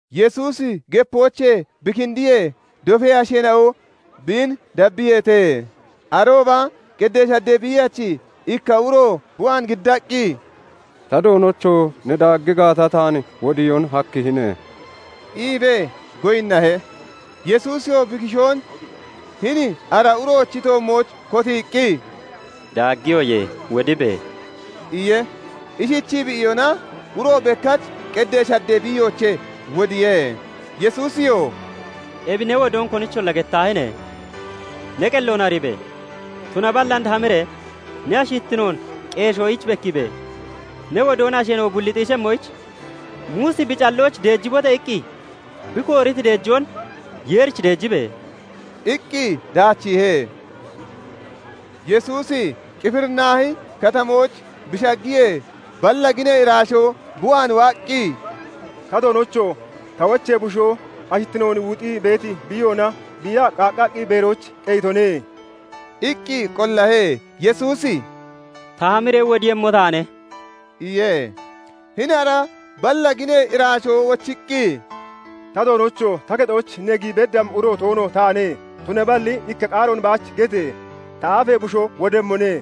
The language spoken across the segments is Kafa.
Yesuusi gepoochee bi kindiyee, dofee asheena'o biin dabbiyeete. Arooba qeddee shaddee biiyachi ikka uro bi waan giddaqqi, "Ta Doonocho! Ne daaggi gaata, taan wodiyoon hakkihine" iibee goyinnahe. Yesuusiyoo bi kishoon hini ara uroochi toommooch kotiiqqi, "Daaggiyoye; wodibe!" iye. Ishichii bi iyona, uro bekkach qeddee shaddee biiyoochee wodiye. Yesuusiyoo "Ebi ne wodoon konicholla gettaahine! Ne qelloon ariibe! Tunaballi and hamiree ne ashittinoon qeeshoyich bekkiibe! Ne wodoon asheena'o bulli xiishemmoyich, Muusi bi callooch 'deejibote!' iqqi bi kooriti deejoon Yeerichi deejibe!" iqqi daachiihe. Yesuusi Qifirnaahi Katamooch bi shaggiyee, balla ginee iraashoo bi waan waaqqi, "Ta Doonocho! Ta wochee bushoo ashittinoon wuxii beeti biiyoona biiyaa qaaqqaqqi beerooch qeyitone" iqqi qollahe. Yesuusi "Ta hamiree wodiiyemmo taane" iye. Hini ara balla ginee iraashoo wochiqqi, "Ta Doonocho! Ta kexooch ne giyi beddammi uro toono taane; tunaballi ikka qaaroon baach gete! Ta aafee bushoo wodemmone.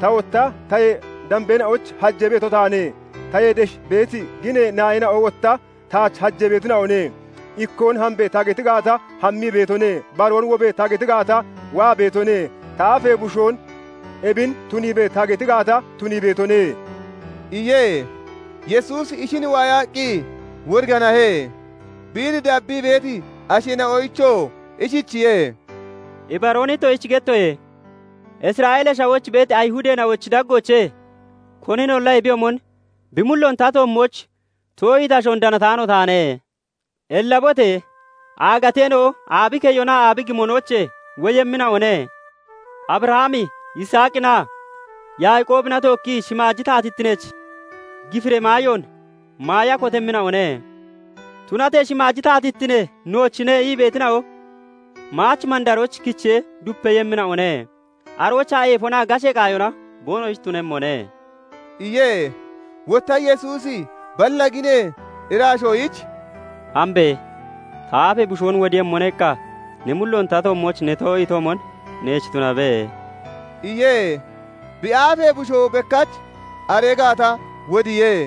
Ta wotta tayee dambeena'oyich hajee beeto taane; tayee desh beeti ginee naayina'o wotta taach hajee beetina'one. Ikkoon 'Hambe!' ta geti gaata, hammii beetone; baroon 'Wobe!' ta geti gaata, waa beetone; ta aafee bushoon 'Ebin tuniibe!' ta geti gaata, tunii beetone" iye. Yesuusi ishin waayaqqi woriganahe; biin dabbii beeti asheena'oyichoo ishichiye:- "Ibaroon ittoshich gettoye; Isra'eelee Shawooch beeti Ayihudeena'ochi daggoochee koninolla ebiyoomon bi mulloon ta toommooch too'iiti ashoon danataano taane. Ellabote! Aagateena'o aabi keyonaa aabi gimonoochee woyemmina'one; Abrahami, Yisaaqinaa Yaaqoobina tookki shimaaji taatittineech gifiree maayoon maaya kotemmina'one; Tunatee 'Shimaaji taatittine noochine' ii beetina'o maach mandarooch kichee dupeeyemmina'one; aroochaa eefonaa gashee qaayona boonoshich tunemmone" iye. Wotta Yesuusi balla ginee iraashoyich "Hambe! 'Ta aafee bushoon wodiiyemmone' iqqa ne mulloon ta toommooch ne too'iitoomon neech tunabe" iye. Bi aafee bushoo bekkach aree gaata wodiye.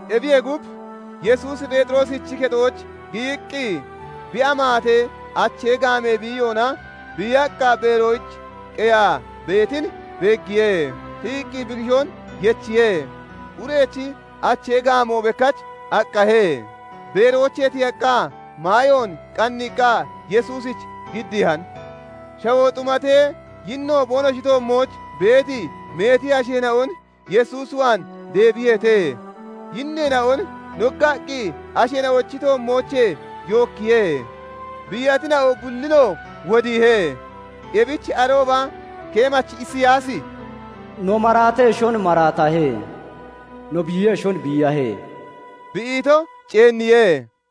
Ebiyee gub, Yesuusi Pheexiroosichi kexooch giyiqqi bi amaatee achee gaamee biiyoona biiyaqqa beerooch qeyaa beetin beeggiye; Tiyiqqi bi kishoon yechiye; urechi achee gaamoo bekkach aqqahe; beeroochee tiyaqqa maayoon qanniiqqa Yesuusich giddiihan. Shawoo xumatee yinno boonoshi toommooch beeti meeti asheena'on Yesuus waan deebiyeete. Yinneena'on noggaqqi asheena'ochi toommoochee yookkiye; biiyatina'o bullinoo wodiihe. Ebich arooba keemachi Isiyaasi "No maraateshon maraatahe; no biiyeshon biiyahe" bi ito ceenniye.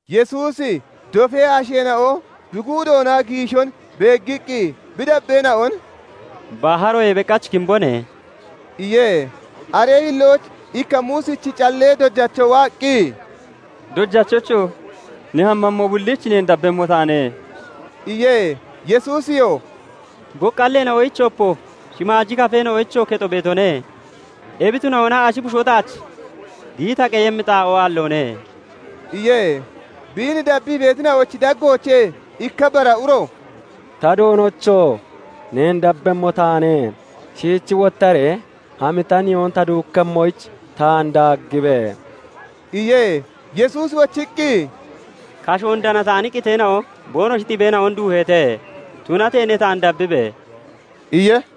Yesuusi dofee asheena'o bi guudoona giishon beeggiqqi bi dabbeena'on "Baharoyee beqach kimbone" iye. Aree hillooch ikka Muusichi callee dojacho waaqqi, "Dojachocho! Ne hammammo bulliich neen dabbemmo taane" iye. Yesuusiyoo "Boqqalleena'oyich opo, shimaaji kafeena'oyichoo kexo beetone; ebi tunahona ashi bushoo taach giyi ta qeyemmi xaa'oo aalloone" iye. Biin dabbii beetina'ochi daggoochee ikka bara uro "Ta Doonocho! Neen dabbemmo taane; shiich wottaree hami ta nihoon ta duukkemmoyich taan daaggibe!" iye. Yesuusi wochiqqi, "Kashoon danataani qiteena'o boonoshi xibeena'on duuheete; tunatee ne taan dabbibe!" iye.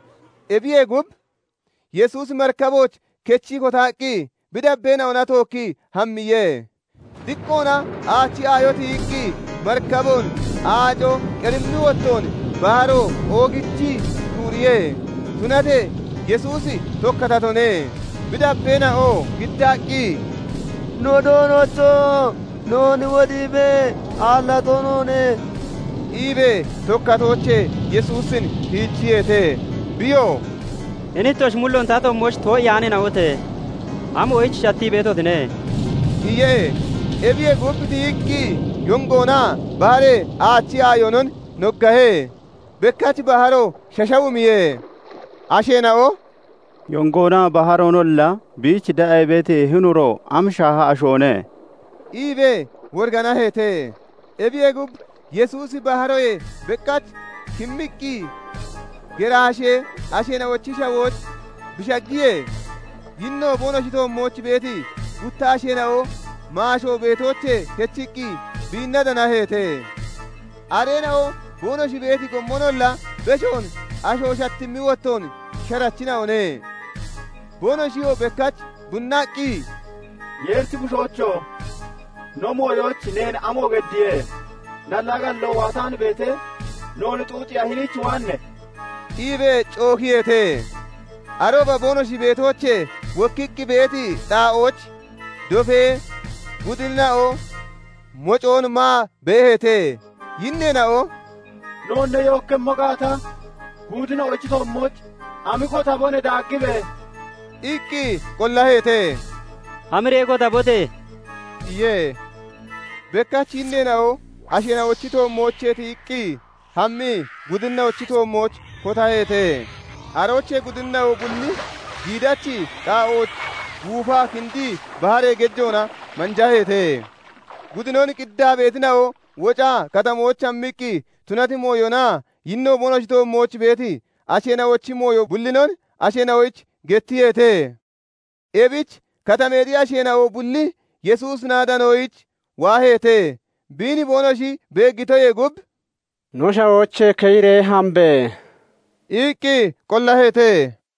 Ebiyee gub, Yesuusi marikabooch kechii kotaqqi bi dabbeena'ona tookkii hammiye. Diqqoona aachi aayo tiyiqqi, marikaboon aaco qerimmi wottoon baharo oogichii shuuriye; tunatee Yesuusi tokkatatone. Bi dabbeena'oo giddaqqi, "No Doonocho! Noon wodiibe! Aallato noone!" iibee tokkatoochee Yesuusin tiijiyeete. Biyoo "Hini ittoshi mulloon ta toommooch too'iyaaneena'ote! Amoyich shattii beetotine?" iye. Ebiyee gub, tiyiqqi yongoonaa baharee aachi aayonon noggahe; bekkach baharo shashawumiye. Asheena'o "Yongoonaa baharoonolla biich de'a ii beeti hini uro am shaaha ashoone?" iibee woriganaheete. Ebiyee gub, Yesuusi baharoyee beqach kimmiqqi Geraashee asheena'ochi shawooch bi shaggiyee, yinno boonoshi toommooch beeti gutta asheena'o maasho beetoochee kechiqqi biinna danaheete. Areena'o boonoshi beeti gommonolla beshoon asho shatammi wottoon sharachina'one. Boonoshiyoo bekkach bunnaqqi, "Yeerichi Bushoocho! No mooyooch neen amo geddiye? Nallaa galloo waataan beetee noon xuuxiiya hiniich waanne?" iibee cookiyeete. Arooba boonoshi beetoochee wokkiqqi beeti xaa'ooch dofee gudinina'o mocoon maa beeheete. Yinneena'o "Noon ne yookkemmo gaata, gudinina'ochi toommooch hami kotabone; daaggibe!" iqqi qollaheete. "Hamiree kotabote!" iye. Bekkach yinneena'o asheena'ochi toommoochee tiyiqqi hammii gudinina'ochi toommooch kotaheete. Aroochee gudinina'o bulli giidachi qaa'ooch guufaa kindii baharee gejoona manjaheete. Gudinon qiddaa beetina'o wocaa katamooch hammiqqi tunati mooyonaa yinno boonoshi toommooch beeti asheena'ochi mooyo bullinon asheena'oyich gettiyeete. Ebich katameexi asheena'o bulli Yesuusina danoyich waaheete; biin boonoshi beeggitoyee gub "No shawoochee keyiree hambe!" iqqi qollaheete.